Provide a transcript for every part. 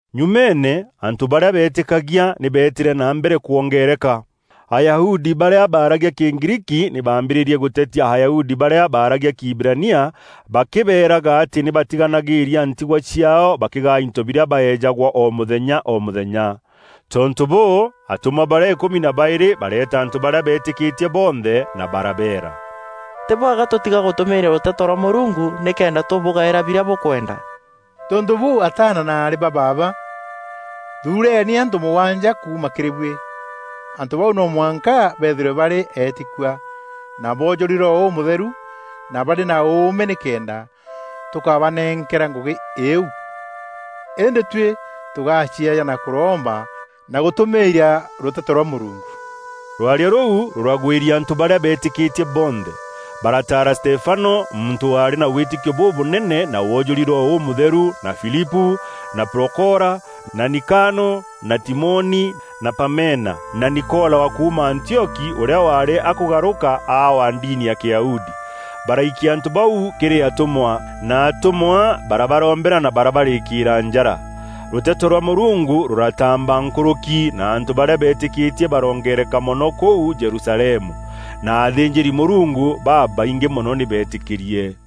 Nyumeene, antû barîa beetîkagia nî beetîre na mbere kwongereka. Ayahudi barîa baaragia Kîgriiki nî baambîrîrie gûtetia Ayahudi barîa baaragia Kiiberania bakîbeeraga atî nî baatiganagîria ntigwa ciaao bakîgaa into birîa baeejagwa o mûthenya o mûthenya. Tontû bûû, atûmwa barîa îkûmi na baîrî bareeta antû barîa beetîkîtie bonthe na barabeera, “Tî bwega tûtiga gûtûmîîria rûteto rwa Mûrungu nîkenda tûbûgaîra birîa bûkwenda. Tontû bûû, ataana na aarî ba baaba, thuureni antû mûgwanja, kuuma kîrî buî. Antû bau no mwanka beethîrwe barî eetîkua, na boojûri Roho Ûmûtheru na barî na ûûme nîkenda tûkabanenkera ngûgî îîu. Îndî tuî tûgacieejana kûromba na gûtûmîîria rûteto rwa Mûrungu.” Rwaria rûu rûragwîria antû barîa beetîkîtie bonthe. Barataara Stefano, muntû waarî na wîtîkio bûbûnene na woojûri Roho Ûmûtheru, na Filipû, na Prokora, na Nikano, na Timoni, na Pamena, na Nikola wa kuuma Antioki ûrîa waarî akûgarûka aa wa ndini ya Kîyahudi. Baraikia antû bau kîrî atûmwa, na atûmwa barabarombera na barabarîkîîra njara. Rûteto rwa Mûrungu rûrataamba nkûrûki, na antû barîa beetîkîtie baroongereka mono kûu Jerusalemu na athînjîri-Mûrungu babaingî mono nî beetîkîrie.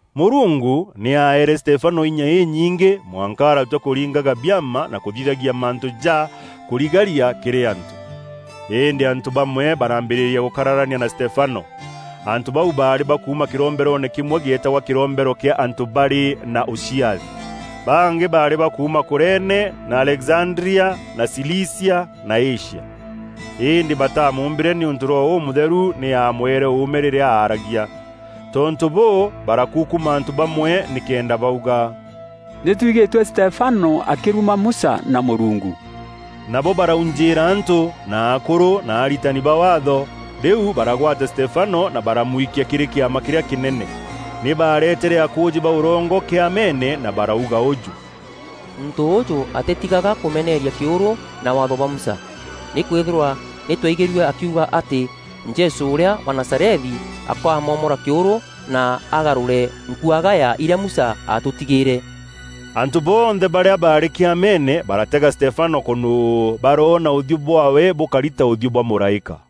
Mûrungu nî aeere Stefano inya înyingî mwanka aratua kûringaga biama na kûthithagia mantû ja kûrigaria kîrî antû. Îndî antû bamwe barambîrîria gûkararania na Stefano. Antû bau baarî ba kuuma kîromberoone kîmwe gîeetagwa kîrombero kîa antû barî na ûciathi. Bangî baarî ba kuuma Kurene na Alexandria na Cilicia na Asia. Îndî batamûmbîre nîûntû Roho Ûmûtheru nî aamweere ûûme rîrîa aaragia. Tontû bûû, barakukuma antû bamwe nîkenda bauga, “Nî twigîtue Stefano akîruma Musa na Mûrungu.” Nabo baraujîîra antû, na akûrû na aritani ba Waatho, rîu baragwata Stefano na baramwikia kîrî Kîama kîrîa kînene. Nî baaretere akûûjî ba ûrongo Kîameene na barauga ûjû, “Muntû ûûjû atîtigaga kûmeneeria kîûrû na Waatho bwa Musa. Nîkwîthîrwa nî twaigîrue akiuga atî Jesû ûrîa wa Nazarethi akamomora kîûrû na agarûre nkuagaya irîa Musa aatûtigîîre.” Antû bonthe barîa baarî Kîameene baratega Stefano kûnûû, baroona ûthiû bwaawe bûkari ta ûthiû bwa mûraîka.